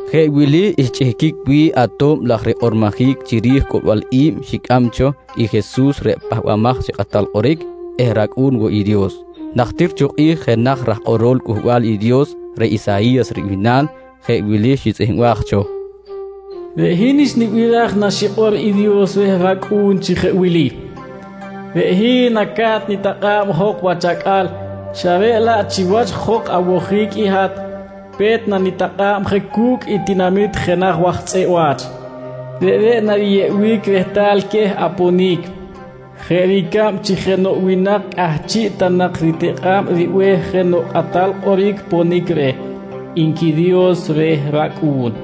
Jeꞌ wili xchꞌihquic wi̱ꞌ ato̱b laj rikꞌormojic chiri̱j coꞌlbal i̱b xicꞌam cho i Jesus reꞌ Pahbamaj chi Kꞌatal Kꞌoric eh rAcꞌu̱n woꞌ i Dios: Najtir cho kꞌi̱j jenaj raj kꞌorol Cꞌuhbal i Dios reꞌ Isayi̱yas ribihnal, jeꞌ wili xitzꞌihmbaj cho: “Reꞌ hin xnibiraj naxikꞌor i Dios reh rAcꞌu̱n chi jeꞌ wili: ‘Reꞌ hin naca̱t nitakꞌa̱b jok wach acꞌal, xa reꞌ laꞌ chiwach jok awojic i hat, pe̱t nanitakꞌa̱b je cu̱cꞌ i tinamit jenaj waj tzꞌeꞌ wa̱ch. Reꞌreꞌ nariyeꞌbic rehtal queh aponic, jeꞌ ricab chi jenoꞌ winak cꞌahchiꞌ ta nak ritikꞌa̱ꞌ ribe̱h jenoꞌ kꞌatal kꞌoric ponic reh, nqui Dios reh rAcꞌu̱n.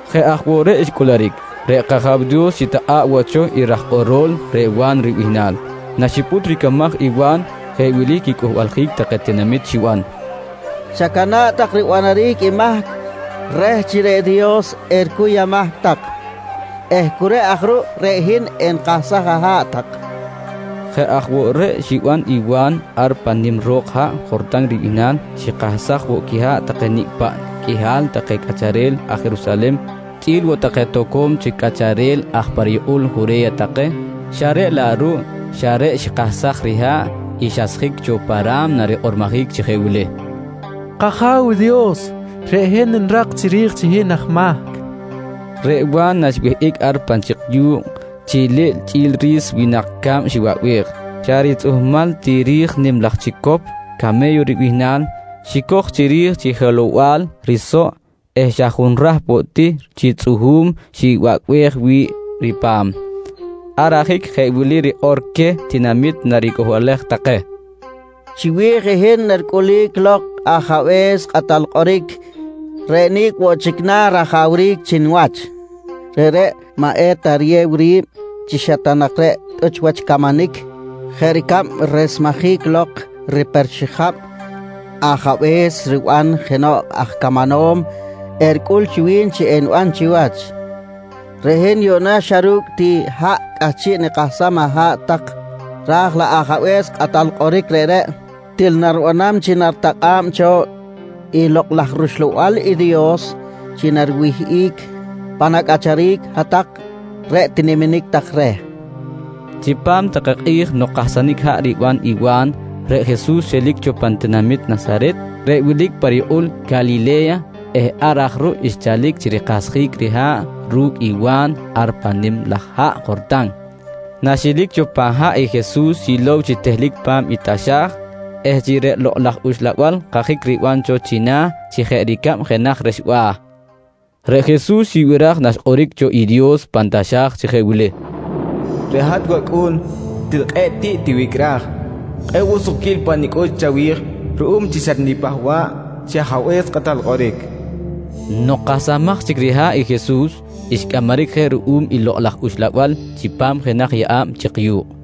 Jeꞌ aj woꞌ reꞌ xcꞌuluric. Reꞌ kAja̱w Dios xitakꞌa̱ꞌ woꞌ cho i raj kꞌorol reꞌ Wa̱n ribihnal. Naxipꞌut ricamaj i Wa̱n jeꞌ wili quicꞌuhbaljic take tinamit xiban: «Chacana̱ꞌ tak ribanaric i mahc reh chi reꞌ Dios ericuy amahc tak eh cu reꞌ aj ruꞌ reꞌ hin enikahsaj aha̱ꞌ tak, nqui queh. Jeꞌ aj woꞌ reꞌ xiban i Wa̱n ar pan nim ro̱k haꞌ Jortan ribihnal. Xikahsaj woꞌ quiha̱ꞌ take nicꞌ paꞌ qꞌuihal take cꞌacharel aj Jerusalen chꞌi̱l woꞌ take toco̱m chic cꞌacharel aj pa riyukꞌul Jure̱ya take, xa reꞌ laꞌ ruꞌ xa reꞌ xikahsaj riha̱ꞌ i xasjic cho pan ra̱mna rikꞌormojic chi jeꞌ wili: «K-Aja̱w Dios, reꞌ hin nirak chiri̱j chi hin aj mahc, nqui xikꞌor. Reꞌ Wa̱n naxwihꞌic ar pan chik yu̱kꞌ, chiliꞌl chꞌi̱l ri̱s winak ca̱b xiwaꞌbej. Xa ritzꞌuhmal ti ri̱j nim laj chicop came̱yo ribihnal xicoj chiri̱j chi jelow-bal risoꞌ eh xa junrahp woꞌ ti chi tzꞌuhu̱m xibacꞌbej wi̱ꞌ ripa̱m. Ar ajic jeꞌ wili rikꞌor queh tinamit naricꞌuhbalej take: «Chiwi̱j i hin naricꞌulic lok i Ajabe̱s Kꞌatal Kꞌoric reꞌ nicꞌ woꞌ chic na̱ rajawric chi niwach. Reꞌreꞌ maꞌ eta riyew ri̱b chi xa ta nak reꞌ tꞌuch wach camanic jeꞌ ricab resmejic lok riper xijab ajabe̱s riban jenoꞌ aj camanom, ericꞌul chi wi̱n chi eniban chiwach. Reꞌ hin yuꞌna xa ru̱cꞌ ti haꞌ cꞌahchiꞌ nikahsam aha̱ꞌ tak raj laꞌ Ajabe̱s Kꞌatal Kꞌoric reꞌreꞌ til naribanam chi naritakꞌa̱b cho i Lokꞌ laj rUxlabal i Dios chi nariwihꞌic pan acꞌacharic hat-tak reꞌ tiniminic tak reh, nqui Wa̱n queh. Chipam take kꞌi̱j nok kahsanic haꞌ riban i Wa̱n, reꞌ Jesus xelic cho pan tinamit Nasaret reꞌ wilic pa riyukꞌul Calile̱ya eh ar aj ruꞌ xchalic chi rikahsjic riha̱ꞌ ru̱cꞌ i Wa̱n ar pan nim laj haꞌ Jortan. Naxelic cho pan haꞌ i Jesus xilow chi tehlic pa̱m i taxa̱j eh chi reꞌ Lokꞌ laj Uxlabal kajic riban cho china̱ chi jeꞌ ricab jenaj rexba̱. Reꞌ Jesus xibiraj naxkꞌoric cho i Dios pan taxa̱j chi jeꞌ wili: «Reꞌ hat wAcꞌu̱n, til kꞌe̱ꞌ tiꞌ tiwicꞌraj. Kꞌe̱ꞌ woꞌ sukquil pa nicꞌux chawi̱j ruꞌum chi xatnipahba̱ꞌ chi Ajabe̱s Kꞌatal Kꞌoric, nqui cho Dios. Nok kahsamaj chic riha̱ꞌ i Jesus xcꞌamaric je ruꞌum i Lokꞌ laj Uxlabal chipam jenaj yeꞌa̱b chik yu̱kꞌ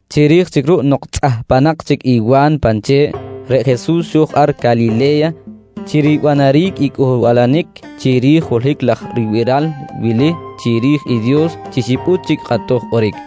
Chiri̱j chic ruꞌ nok tzꞌahpanak chic i Wa̱n pan che̱ꞌ, reꞌ Jesus xo̱j ar Calile̱ya chi ribanaric i cꞌuhbalanic chiri̱j holohic laj ribiral wili chiri̱j i Dios chi xipꞌut chic kꞌatoj kꞌoric.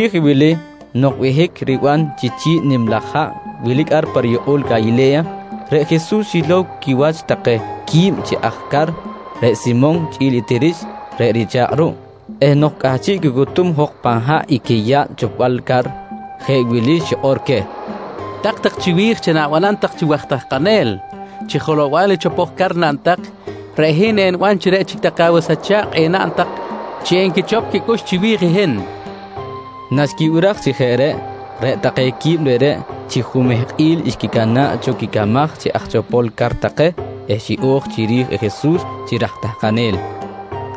Chiri̱j i wili nok behic riban chi chi̱ꞌ nim laj haꞌ wilic ar pa riyukꞌul Calile̱ya, reꞌ Jesus xilow quiwach take qui̱b chi aj car reꞌ Simon chꞌi̱l i Tirix reꞌ richa̱kꞌ ruꞌ eh nok cꞌahchiꞌ quicutum jok pan haꞌ i quiyaꞌl chopbal car, jeꞌ wili xikꞌor queh: «Tak tak chiwi̱j chi na̱banam tak chi waj tahkanel. Chi jelow-bal i chopoj car naꞌn tak, reꞌ hin eniban chi reꞌ chic take awas acha̱kꞌ enaꞌn tak chi enquichop quicꞌux chiwi̱j i hin, nqui queh. Naxquibiraj chi jeꞌ reꞌ, reꞌ take qui̱b reꞌreꞌ chi jumehkꞌil xquicana̱ꞌ cho quicamaj chi aj chopol car take eh xiꞌo̱j chiri̱j i Jesus chi raj tahkanel.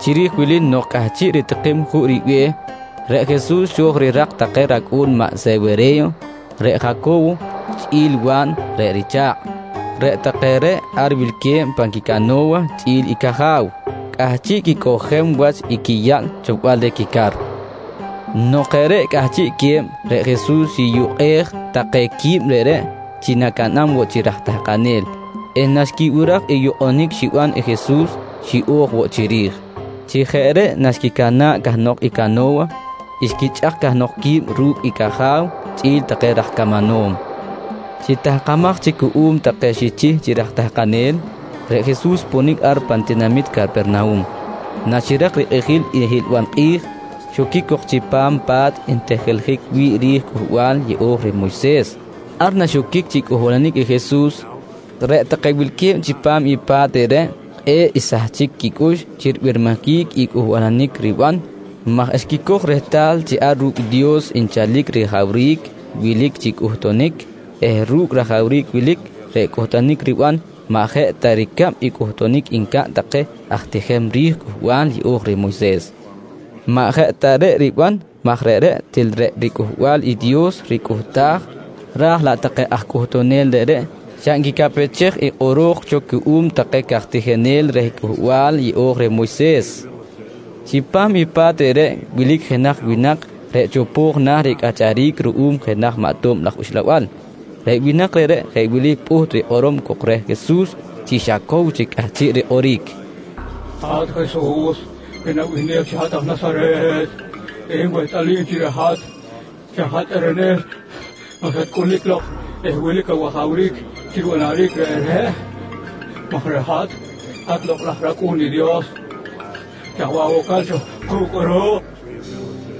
Chiri̱j wili nok cꞌahchiꞌ ritikim juꞌ ribe̱h, reꞌ Jesus xo̱j rirak take racꞌu̱n maꞌ Sewere̱yo, reꞌ Jaco̱wo chꞌi̱l i Wa̱n reꞌ richa̱kꞌ. Reꞌ take reꞌ ar wilque̱b pan quicano̱wa chꞌi̱l i caja̱w, cꞌahchiꞌ quicꞌojem wach i quiyaꞌl chopbal quica̱r. Nok jeꞌ reꞌ cꞌahchiꞌque̱b, reꞌ Jesus xiyukꞌej take qui̱b reꞌreꞌ chi nacaꞌnam woꞌ chi raj tahkanel eh naxquibiraj i yukꞌunic xiban i Jesus xiꞌo̱j woꞌ chiri̱j. Chi jeꞌ reꞌ naxquicana̱ꞌ cahnok i cano̱wa, xquichꞌak cahnok qui̱b ru̱cꞌ i caja̱w chꞌi̱l take raj camanom. Chi tahkamaj chic cuꞌum take xichih chi raj tahkanel, reꞌ Jesus xponic ar pan tinamit Capernahum. Naxirak rikꞌijil i hiꞌlbal kꞌi̱j, xoquic cok chipam pa̱t ntijiljic wi̱ꞌ ri̱j i Cꞌuhbal yeꞌo̱j reh i Moyses. Ar naxoquic chi cꞌuhbalanic i Jesus, reꞌ take wilque̱b chipam i pa̱t reꞌreꞌ kꞌe̱ꞌ xsahchic quicꞌux chi ribirmijic i cꞌuhbalanic riban maj xquicoj rehtal chi ar ru̱cꞌ i Dios nchalic i rajawric wilic chi cꞌuhtunic eh ru̱cꞌ rajawric wilic, reꞌ cꞌuhtunic riban maꞌ jeꞌ ta ricab i cꞌuhtunic ncaꞌn take aj tijem ri̱j Cꞌuhbal Yeꞌo̱j reh Moyses. Maꞌ jeꞌ ta reꞌ riban maj reꞌreꞌ til reꞌ riCꞌuhbal i Dios ricꞌuhtaj raj laꞌ take aj cꞌuhtunel reꞌreꞌ xa nquicaꞌpechej i kꞌoro̱j cho cuꞌum take caj tijinel reh i Cꞌuhbal Yeꞌo̱j reh Moyses. Chipam i pa̱t reꞌreꞌ wilic jenaj winak reꞌ chopo̱j na̱ ricꞌacharic ruꞌum jenaj maꞌ tob laj uxlabal. Reꞌ winak reꞌreꞌ jeꞌ wili pꞌuht rikꞌorom cok reh Jesus chi xa cow chic cꞌahchiꞌ rikꞌoric: «Hat Jesus reꞌ nabihnej chi aj Nasaret, reꞌ hin wehtꞌalim chi reꞌ hat xa hat tꞌerenel nok xatcꞌulic lok eh wilic awajawric chi ribanaric reꞌreꞌ maj reꞌ hat, hat Lokꞌ laj rAcꞌu̱n i Dios. Chaj bih awocal cho ku̱cꞌ kꞌuruꞌ? nqui reh.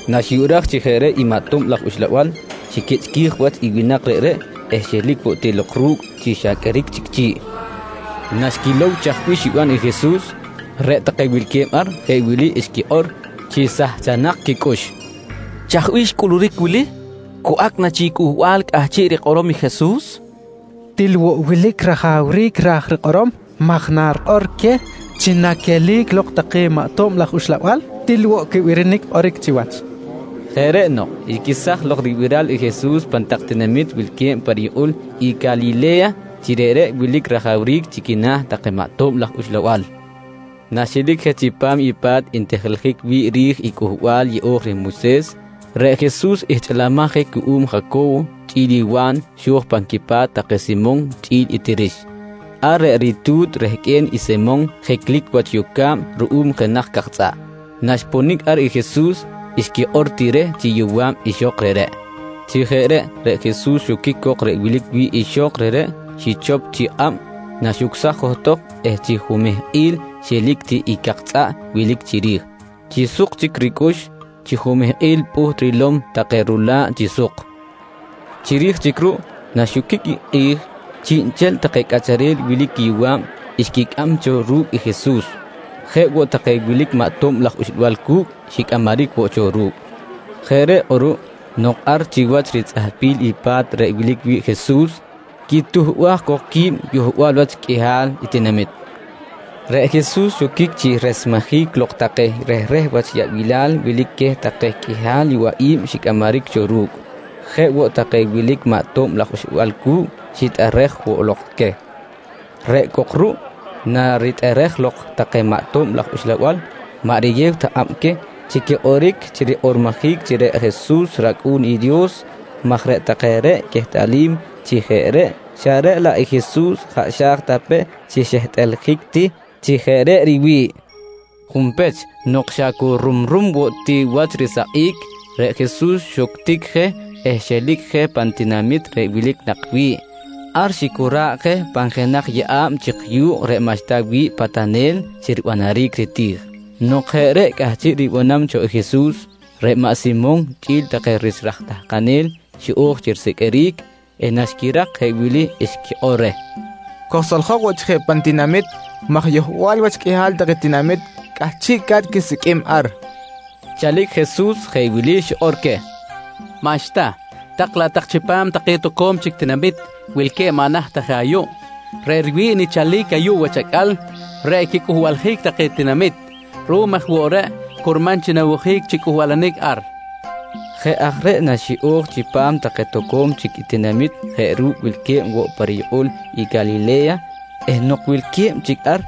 Naxbiraj chi jeꞌ reꞌ i maꞌ tob laj uxlabal, xiquichꞌquij wach i winak reꞌreꞌ eh xelic woꞌ ti lok ru̱cꞌ chi xa qꞌueric chic chi̱ꞌ. Naxquilow chaj bih xiban i Jesus, reꞌ take wilque̱b ar jeꞌ wili xquikꞌor chi sahchanak quicꞌux: «Chaj bih xcꞌuluric wili? Cu acꞌ na chic i cꞌuhbal cꞌahchiꞌ rikꞌorom i Jesus? Til woꞌ wilic rajawric ra̱j rikꞌorom maj narikꞌor queh chi naquelic lok take maꞌ tob laj uxlabal til woꞌ quibirinic kꞌoric chiwach, nqui take. Jeꞌ reꞌ nok, xquesaj lok ribiral i Jesus pan tak tinamit wilque̱b pa riyukꞌul i Calile̱ya chi reꞌreꞌ wilic rajawric chi quina̱ take maꞌ tob laj uxlabal. Naxelic je chipam i pa̱t ntijiljic wi̱ꞌ ri̱j i Cꞌuhbal Yeꞌo̱j reh Moyses, reꞌ Jesus ihchꞌilimaj je ruꞌum Jaco̱wo chꞌi̱l i Wa̱n xo̱j pan quipa̱t take Simon chꞌi̱l i Tirix. Ar reꞌ ritu̱t rehqꞌue̱n i Simon jiclic wach yoca̱b ruꞌum jenaj cak tzꞌaꞌ. Naxponic ar i Jesus xquikꞌor ti reh chi yowa̱b ixok reꞌreꞌ. Chi jeꞌ reꞌ, reꞌ Jesus xoquic cok reꞌ wilic wi̱ꞌ ixok reꞌreꞌ, xichop chi kꞌab naxucsaj johtok eh chi jumehkꞌil xelic ti i cak tzꞌaꞌ wilic chiri̱j. Chi suk chic ricꞌux, chi jumehkꞌil pꞌuht rilom take rula̱ꞌ chi suk. Chiri̱j chic ruꞌ naxoquic i kꞌi̱j, chiꞌnchel take cꞌacharel wilic quiyowa̱b xquicꞌam cho ru̱cꞌ i Jesus. Jeꞌ woꞌ take wilic maꞌ tob laj uxlabal cu̱cꞌ xicꞌamaric woꞌ cho ru̱cꞌ. Jeꞌ reꞌ kꞌuruꞌ nok ar chiwach ritzꞌahpil i pa̱t reꞌ wilic wi̱ꞌ i Jesus quituhbaj cok qui̱b yohbal wach qꞌuihal tinamit, reꞌ Jesus xoquic chi resmejic lok take rehreh wach yaꞌbilal wilic queh take qꞌuihal yowaꞌi̱b xicꞌamaric cho ru̱cꞌ. Jeꞌ woꞌ take wilic maꞌ tob laj uxlabal cu̱cꞌ xitꞌerej woꞌ lok queh. Reꞌ cok ruꞌ naritꞌerej lok take maꞌ tob laj uxlabal maꞌ riyew ta kꞌab queh chi quikꞌoric chi rikꞌormojic chi reꞌ Jesus rAcꞌu̱n i Dios maj reꞌ take reꞌ quehtꞌalim chi jeꞌ reꞌ xa reꞌ laꞌ i Jesus jaꞌ xa̱j ta pe chi xehtꞌaljic ti chi jeꞌ reꞌ riwi̱ꞌ. Junpech, nok xa cu rumrum woꞌ ti wach risakꞌic, reꞌ Jesus xuctic je eh xelic je pan tinamit reꞌ wilic nak wi̱ꞌ. Ar xicora̱ꞌ je pan jenaj yeꞌa̱b chik yu̱kꞌ reꞌ maꞌxta wi̱ꞌ patanel chi ribanaric riti̱j. Nok jeꞌ reꞌ cꞌahchiꞌ ribanam cho i Jesus, reꞌ maꞌ Simon chꞌi̱l take rich aj tahkanel xiꞌo̱j chi risiqꞌuiric eh naxquirak jeꞌ wili xquikꞌor reh: «Kojsoljok woꞌ chic je pan tinamit maj yohbal wach qꞌuihal take tinamit cꞌahchiꞌca̱t quisiqꞌuim ar, nqui take reh. Chalic Jesus jeꞌ wili xikꞌor queh: «Maꞌxta, tak laꞌ tak chipam take toco̱m chic tinamit wilque̱b maꞌ naht ta je ayuꞌ. Reꞌ riwi̱ꞌ nichalic ayuꞌ wach acꞌal, reꞌ i quicꞌuhbaljic take tinamit. Ruꞌum aj woꞌ reꞌ curman chi nawojic chi cꞌuhbalanic ar, nqui queh. Jeꞌ aj reꞌ naxiꞌo̱j chipam take toco̱m chic tinamit jeꞌ ru̱cꞌ wilque̱b woꞌ pa riyukꞌul i Calile̱ya eh nok wilque̱b chic ar,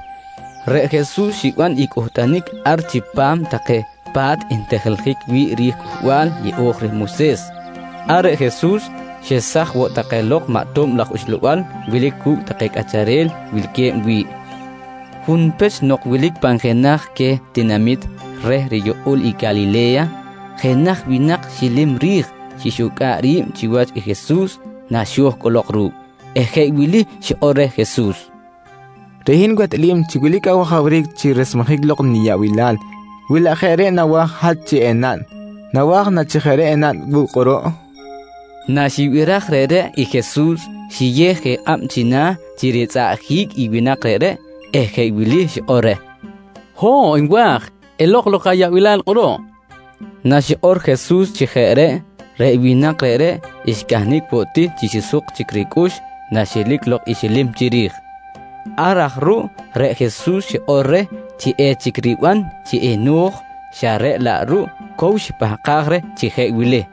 reꞌ Jesus xiban i cꞌuhtunic ar chipam take pa̱t ntijiljic wi̱ꞌ ri̱j i Cꞌuhbal Yeꞌo̱j reh Moyses. Ar reꞌ Jesus xesaj woꞌ take lok maꞌ tob laj uxlabal wilic cu̱cꞌ take cꞌacharel wilque̱b wi̱ꞌ. Junpech nok wilic pan jenaj queh tinamit reh riyukꞌul i Calile̱ya, jenaj winak xilim ri̱j xixucꞌa̱ꞌ ri̱b chiwach i Jesus naxo̱j cꞌolok ru̱cꞌ eh jeꞌ wili xikꞌor reh Jesus: «Reꞌ hin wehtꞌalim chi wilic awajawric chi resmejic lok niyaꞌbilal wi laꞌ jeꞌ reꞌ nawa̱j i hat chi enaꞌn. Nawa̱j na chi jeꞌ reꞌ enaꞌn wu̱cꞌ kꞌuruꞌ? nqui reh. Naxibiraj reꞌreꞌ i Jesus xiyew je kꞌab china̱ chi ritzꞌaꞌjic i winak reꞌreꞌ eh jeꞌ wili xikꞌor reh: «Ho̱ꞌ nwa̱j! Elok lok ayaꞌbilal kꞌuruꞌ, nqui reh. Naxikꞌor Jesus chi jeꞌ reꞌ, reꞌ winak reꞌreꞌ xcahnic woꞌ ti chi suk chic ricꞌux naxelic lok i xilim chiri̱j. Ar aj ruꞌ reꞌ Jesus xikꞌor reh chi echic riban chi eno̱j, xa reꞌ laꞌ ruꞌ cow xipahkaj reh chi jeꞌ wili: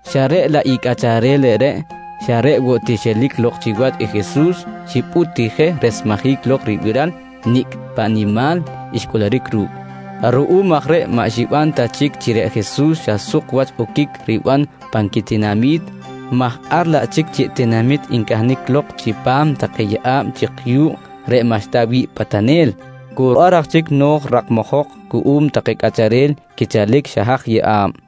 Xa reꞌ laꞌ i cꞌacharel reꞌreꞌ xa reꞌ woꞌ ti xelic lok chiwach i Jesus xipꞌut ti je resmejic lok ribiral i nicꞌ paꞌ nimal xcꞌuluric ru̱cꞌ. Ruꞌum aj reꞌ maꞌ xiban ta chic chi reꞌ Jesus xa suk wach oquic riban pan quitinami̱t maj ar laꞌ chic chiꞌ tinamit ncahnic lok chipam take yeꞌa̱b chik yu̱kꞌ reꞌ maꞌxta wi̱ꞌ patanel. Cu ar aj chic no̱j rakmajok cuꞌum take cꞌacharel quichalic xa haj yeꞌa̱b.